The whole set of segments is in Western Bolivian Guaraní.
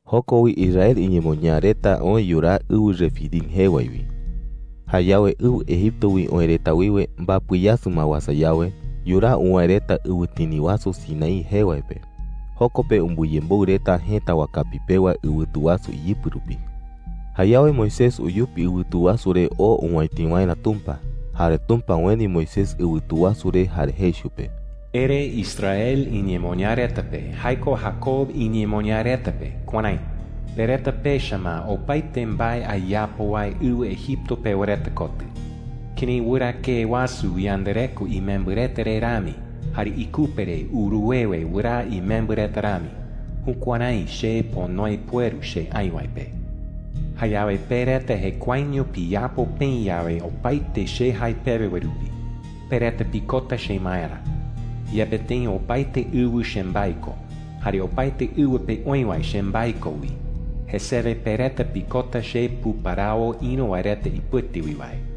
Joko wi Israel iñemoñaa reta oë yuraa ɨwɨ Refidim jee wae wi. Jayawe ɨwɨ Egipto wi oë reta wiwe mbapɨ yasɨ ma uasa yawe, yuraa uwäe reta ɨwɨtini wasu Sinaí jee wae pe. Joko pe umbɨyemboɨ reta jëta wakapi pewa ɨwɨtu wasu iyɨpɨ rupi. Jayawe Moisés uyupi ɨwɨtu wasu re oo owäiti waerä Tumpa. Jare Tumpa ueni Moisés ɨwɨtu wasu re jare jei chupe: “Ere Israel iñemoñaa reta pe – jae ko Jacob iñemoñaa reta pe – kuärái: ‘Pe reta pecha ma opaete mbae ayapo wae ɨwɨ Egipto pewa reta kotɨ. Kërái wɨrakee wasu uyandareko imembɨ reta re rami jare ikupe re uruwewe wɨraa imembɨ reta rami, jukuärái che ponoe pueru che aï wae pe. Jayawe pe reta jekuaeño piyapo peï yawe opaete che jae pewe wae rupi, pe reta pikota chemaerä. Yepe tëi opaete ɨwɨ chembae ko, jare opaete ɨwɨ pe oï wae chembae ko wi, jesewe pe reta pikota che puparawo ïru wae reta ipɨte wi wae.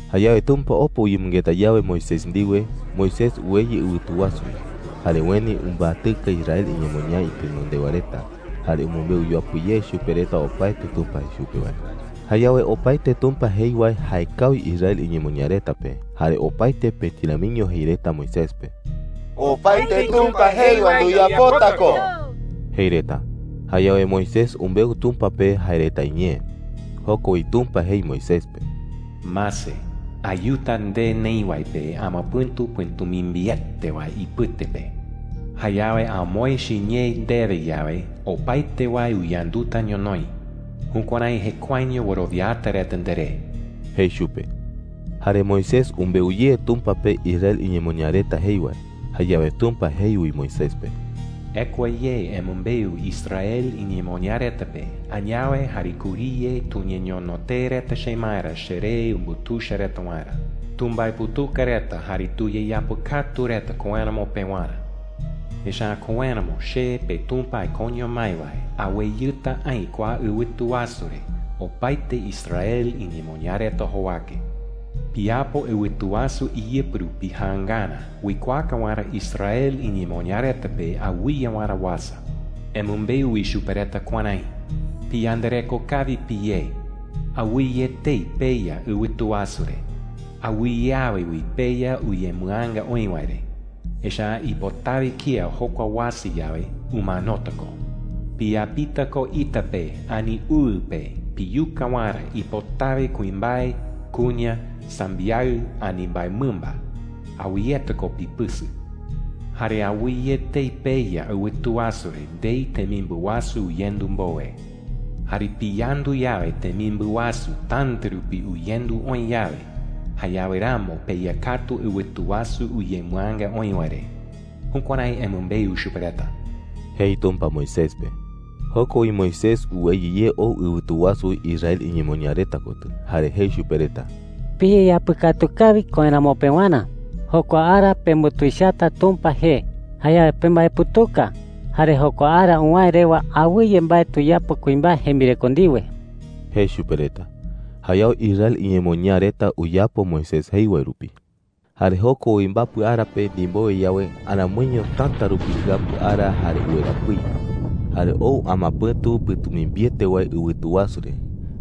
Jayawe Tumpa opa uyemɨngeta yawe Moisés ndiwe, Moisés uweyɨ ɨwɨtu wasu wi. Jare ueni umbatɨka Israel iñemoñaa itenondewa reta, jare umɨmbeu yuapɨ ye chupe reta opaete Tumpa jei chupe wae. Jayawe opaete Tumpa jei wae jaekawi Israel iñemoñaa reta pe, jare opaete pëti ramiño jei reta Moisés pe: “¡Opaete Tumpa jei wae nduyapota ko!” jei reta. Jayawe Moisés umbeu Tumpa pe jae reta iñee. Joko wi Tumpa jei Moisés pe: “Mase, ayuta nde neï wae pe amapɨ̈tu pɨ̈tumimbiete wae ipɨte pe,” jei. “Jayawe amoë chiñee ndewe yawe, opaete wae uyanduta ñonoï. Jukuärái jekuaeño wɨrowiata reta nderé,” jei chupe. Jare Moisés umbeu ye Tumpa pe Israel iñemoñaa reta jei wae. Jayawe Tumpa jei wi Moisés pe: “Ekua ye emɨmbeu Israel iñemoñaa reta pe, añawe jare kuriye tuñeñono tee reta chemaerä cheree umbutuicha reta waerä. Tumbaeputuka reta jare tuyeyapɨkatu reta koéramo pewarä. Echa’ä koéramo che, peTumpa aikoño mái wae, aweyɨta aï kua ɨwɨtu wasu re opaete Israel iñemoñaa reta jowake,” jei chupe. “Piyapo ɨwɨtu wasu iyɨpɨ rupi jaangarä uikuaaka waerä Israel iñemoñaa reta pe awɨye waerä uasa,” jei. “Emɨmbeu wi chupe reta kuärái: ‘¡Piyandareko kawi piyé! Awɨye etei peya ɨwɨtu wasu re. Awɨye awe wi peya uyemɨaanga oï wae re. Echa’ä ipotawe kía jokua uasa yawe, umanota ko. Piyapita ko ita pe ani uɨ pe piyuka waerä ipotawe kuimbae, kuña, sambiaɨ, ani mbaemɨmba. Awɨyeta ko pipɨsɨ. Jare awɨye etei peya ɨwɨtu wasu re ndei temimbɨ wasu uyendu mbowe. Jare piyandu yawe temimbɨ wasu täta rupi uyendu oï yawe, jayawe ramo peya katu ɨwɨtu wasu uyemɨaanga oï wae re.’ Jukuärái emɨmbeu chupe reta,” jei Tumpa Moisés pe. Joko wi Moisés uweyɨ ye ou ɨwɨtu wasu wi Israel iñemoñaa reta kotɨ, jare jei chupe reta: “Piyeyapɨkatu kawi koéramo pewarä,” jei. “Jokua ara pembutuichata Tumpa jee. Jayawe pembaeputuka, jare jokua ara uwäe rewa awɨye mbae tuyapo kuimbae jembireko ndiwe,” jei chupe reta. Jayawe Israel iñemoñaa reta uyapo Moisés jei wae rupi. Jare joko wi mbapɨ ara pe ndimbowe yawe, aramoiño täta rupi jɨapu ara jare uwera pɨi. Jare ou amapɨ̈tu pɨ̈tumimbiete wae ɨwɨtu wasu re.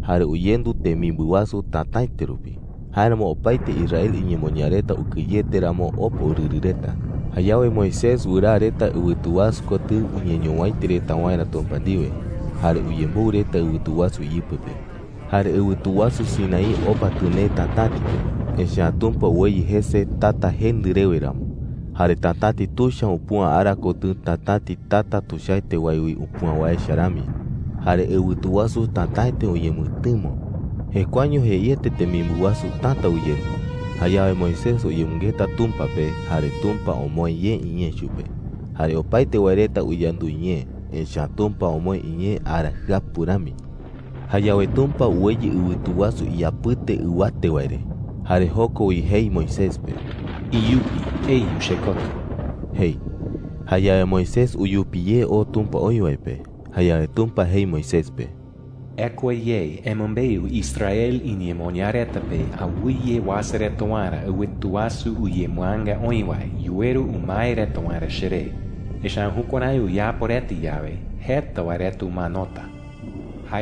Jare uyendu temimbɨ wasu tätaete rupi. Jáeramo opaete Israel iñemoñaa reta ukɨyete ramo opa urɨrɨ reta. Jayawe Moisés wɨraa reta ɨwɨtu wasu kotɨ uñeñowäiti reta waerä Tumpa ndiwe. Jare uyemboɨ reta ɨwɨtu wasu iyɨpɨ pe. Jare ɨwɨtu wasu Sinaí opa tɨnee tatäti pe, echa’ä Tumpa uweyɨ jese tata jendɨ rewe ramo. Jare tatäti tuicha upüa ara kotɨ tatäti tata tuichaete wae wi upüa wae echa rami. Jare ɨwɨtu wasu tätaete uñemɨtɨmo. Jekuaeño jeiete temimbɨ wasu täta uyendu. Jayawe Moisés uyemɨngeta Tumpa pe, jare Tumpa omoë ye iñee chupe. Jare opaete wae reta uyandu iñee, echa’ä Tumpa omoë iñee ara jɨapu rami. Jayawe Tumpa uweyɨ ɨwɨtu wasu iyapɨte ɨwatete wae re. Jare joko wi jei Moisés pe: “Iyupe eyu chekotɨ,” jei. Jayawe Moisés uyupi ye oo Tumpa oï wae pe. Jayawe Tumpa jei Moisés pe: “Ekua ye emɨmbeu Israel iñemoñaa reta pe awɨye uasa reta waerä ɨwɨtu wasu uyemɨaanga oï wae yuweru umae reta waerä cheré. Echa’ä jukuärái uyapo reta yawe, jeta wae reta umanota,” jei.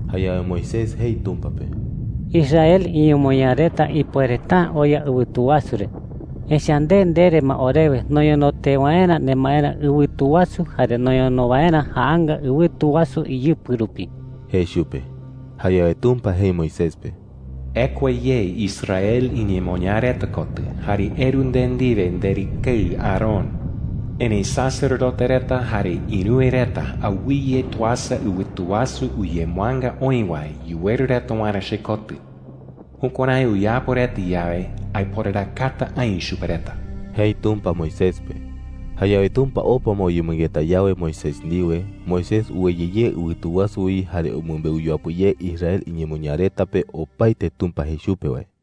Jayawe Moisés jei Tumpa pe: “Israel iñemoñaa reta ipuereta’ä oya ɨwɨtu wasu re, echa’ä nde ndere ma orewe noñono tee waerä nemaerä ɨwɨtu wasu jare noñono waerä jaanga ɨwɨtu wasu iyɨpɨ rupi,” jei chupe. Jayawe Tumpa jei Moisés pe: “Ekua ye Israel iñemoñaa reta kotɨ jare eru nde ndiwe nderɨkeɨ Aarón. Erëi sacerdote reta jare ïruwe reta awɨye tuasa ɨwɨtu wasu uyemɨaanga oï wae yuweru reta waerä chekotɨ. Jukuärái uyapo reta yawe, aiporarakata aï chupe reta,” jei Tumpa Moisés pe. Jayawe Tumpa opa ma uyemɨngeta yawe Moisés ndiwe, Moisés uweyɨ ye ɨwɨtu wasu wi jare umɨmbeu yuapɨ ye Israel iñemoñaa reta pe opaete Tumpa jei chupe wae.